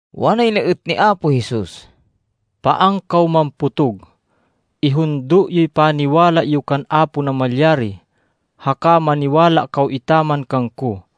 Wanay na êt ni Apo Jesus, “Paan kaw mampotog. Ihundo yoy paniwala yo kan Apo Namalyari haka maniwala kaw etaman kangko.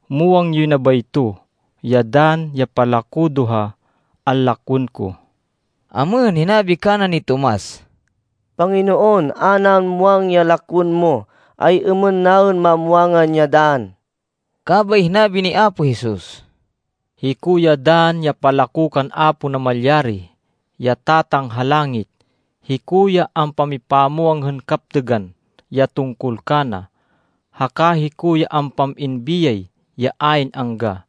Muwang yoy na bayto, ya dann ya palako do ha anlakwên ko.” Amêhên, hinabi kana ni Tomas, “Panginoon, a naên muwang ya lakwên mo, ay-êmên naên mamwangan ya dann?” Kabay hinabi ni Apo Jesus, “Hiko ya dann ya palako kan Apo Namalyari, ya Tatang ha langit. Hiko ya ampamipamwang hên kaptêgan ya tungkol kana, haka hiko ya ampam-in biyay ya ayn angga.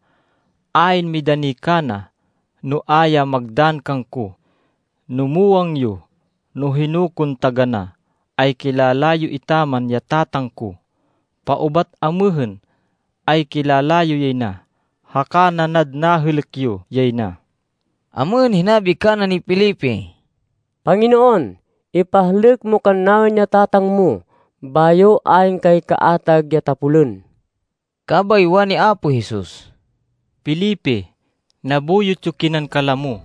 Ayn midani kana, no a ya magdann kangko. No muwang yo no hino kon taganá, ay kilala yo etaman ya Tatang ko. Paubat amêhên, ay kilala yo yay na, haka nanad nahêlêk yo yay na.” Amêhên, hinabi kana ni Felipe, “Panginoon, ipahlêk mo kannaên ya Tatang mo. Bayo ayn kay kaatag ya tapolên.” Kabay wani Apo Jesus, “Felipe, nabuyot yo kinan kalamo.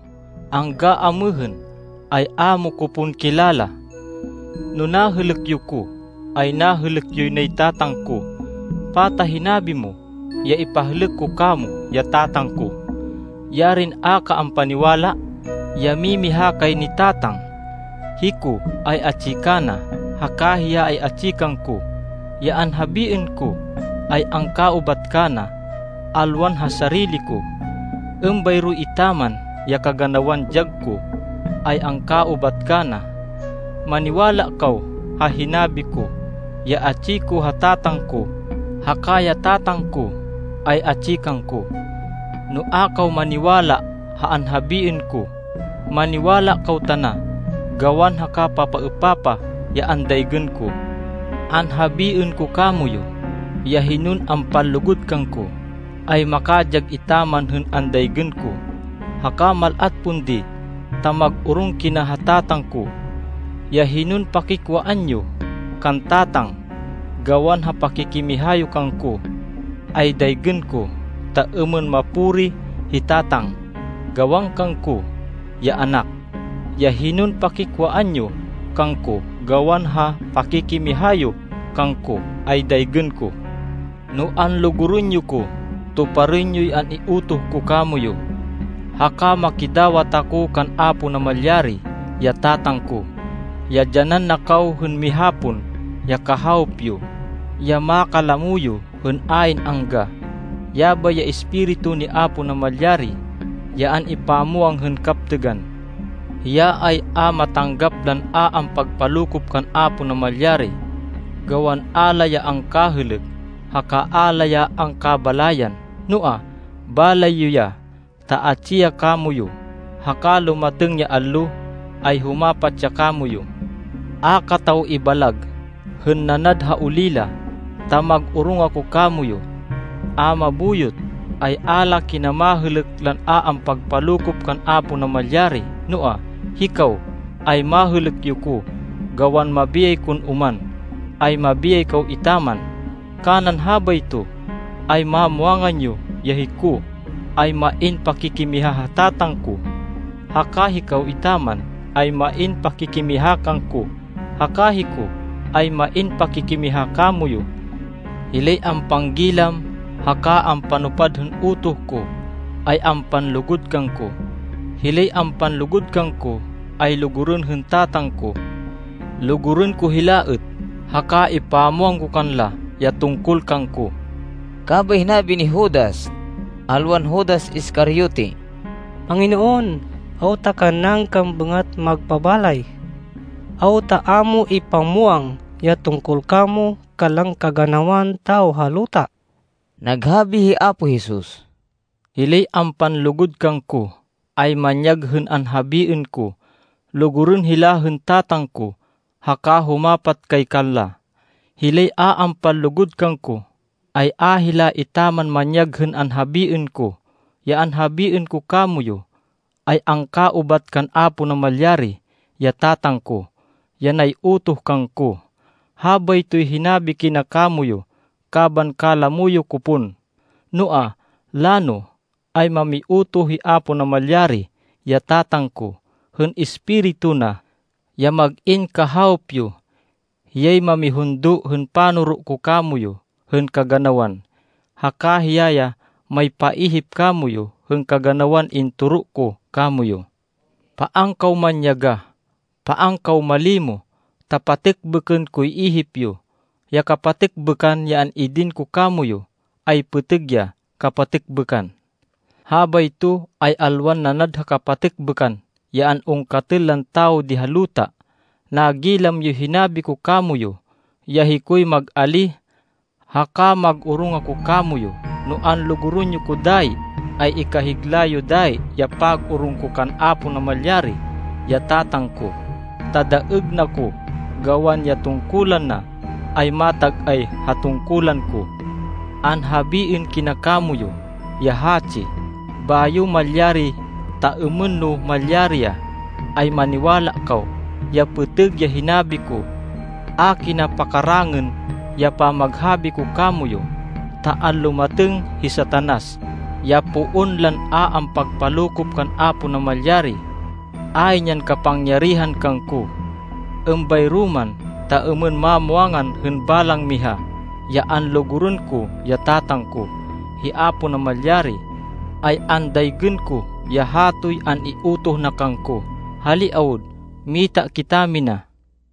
Angga amêhên, ay a mo ko pon kilala? No nahêlêk yo ko, ay nahêlêk yoy nay Tatang ko. Pata hinabi mo ya ipahlêk ko kamo ya Tatang ko? Yarin a ka ampaniwala, ya mimiha kay ni Tatang? Hiko ay atsi kana, haka hiya ay atsi kangko. Ya anhabiên ko, ay angkaubat kana alwan ha sarili ko. Êmbayro etaman ya kaganawan dyag ko, ay angkaubat kana. Maniwala kaw ha hinabi ko ya atsi ko ha Tatang ko, haka ya Tatang ko ay atsi kangko. No a kaw maniwala ha anhabiên ko, maniwala kaw tana, gawan ha kapapaêpapah ya andaygên ko. Anhabiên ko kamoyu, ya hinon ampanlugud kangko, ay makadyag etaman hên andaygên ko, haka mal-at pon di, ta mag-orong kina ha Tatang ko. Ya hinon pakikwaan yo kan Tatang, gawan ha pakikimiha yo kangko, ay daygên ko ta êmên mapuri hi Tatang, gawan kangko, ya Anak. Ya hinon pakikwaan yo kangko gawan ha pakikimiha yo kangko, ay daygên ko.” “No anlugurên yo ko, tuparên yoy an-iutoh ko kamoyu. Haka makidawat ako kan Apo Namalyari, ya Tatang ko, ya dyanan na kaw hên miha pon ya Kahawop yo, ya makalamo yo hên ayn angga. Yabay ya Espiritu ni Apo Namalyari ya an-ipamwang hên kaptêgan. Hiya ay a matanggap lan a ampagpalokop kan Apo Namalyari, gawan a la ya angkahêlêk, haka a la ya angkabalayan. Noa, balay yo ya, ta atsi ya kamoyu, haka lumatêng ya allo, ay humapat ya kamoyu. “A kataw ibalag hên nanad ha olila ta mag-orong ako kamoyu. A mabuyot ay, a la kina mahêlêk lan a ampagpalokop kan Apo Namalyari. Noa, hikaw, ay mahêlêk yo ko. Gawan mabiyay kon oman, ay mabiyay kaw etaman. Kanan habayto, ay mamwangan yo ya hiko, ay main pakikimiha ha Tatang ko, haka hikaw etaman ay main pakikimiha kangko, haka hiko ay main pakikimiha kamoyu. “Hilay ampanggilam haka ampanupad hên utoh ko, ay ampanlugud kangko. Hilay ampanlugud kangko, ay lugurên hên Tatang ko. Lugurên ko hila êt, haka ipamwang ko kanla, ya tungkol kangko.” Kabay hinabi ni Judas (alwan Judas Iscariote), “Panginoon, awta kannaên kan bêngat magpabalay? Awta a mo ipamwang ya tungkol kamo kanlan kaganawan tawo ha luta?” Naghabi hi Apo Jesus, “Hilay ampanlugud kangko, ay manyag hên anhabiên ko. Lugurên hila hên Tatang ko, haka humapat kay kanla. Hilay a ampanlugud kangko, ay a hila etaman manyag hên anhabiên ko. Ya anhabiên ko kamoyu, ay angkaubat kan Apo Namalyari, ya Tatang ko, ya nay-utoh kangko.” “Habaytoy hinabi kina kamoyu kaban kalamo yo ko pon. Noa, lano, ay mamiutoh hi Apo Namalyari, ya Tatang ko, hên Espiritu na, ya mag-in Kahawop yo. Hiyay mamihundo hên panoro ko kamoyu hên kaganawan, haka hiya ya maypaihip kamoyu hên kaganawan intoro ko kamoyu.” “Paan kaw manyagah. Paan kaw malimo. Ta patêkbêkên koy ihip yo. Ya kapatêkbêkan ya an-idin ko kamoyu, ay pêtêg ya kapatêkbêkan. Habayto ay alwan nanad ha kapatêkbêkan ya an-ungkatên lan tawo di ha luta. Nagilam yoy hinabi ko kamoyu ya hikoy mag-alíh. Haka mag-orong ako kamoyu. No anlugurên yo ko dayi, ay ikahigla yo dayi ya pag-orong ko kan Apo Namalyari, ya Tatang ko, ta daêg na ko gawan ya tungkulan na ay matag-ay ha tungkulan ko. Anhabiên kina kamoyu ya hatsi bayo malyari, ta êmên no malyari ya, ay maniwala kaw, ya pêtêg ya hinabi ko. A kina pakakarangên ya pamaghabi ko kamoyu, ta anlumatêng hi Satanas, ya poon lan a ampagpalokop kan Apo Namalyari. Ayn yan kapangyarihan kangko. Êmbayro man, ta êmên mamwangan hên balang miha, ya anlugurên ko ya Tatang ko, hi Apo Namalyari, ay andaygên ko ya hatoy an-iutoh na kangko. Hali awud, mita kitamina.”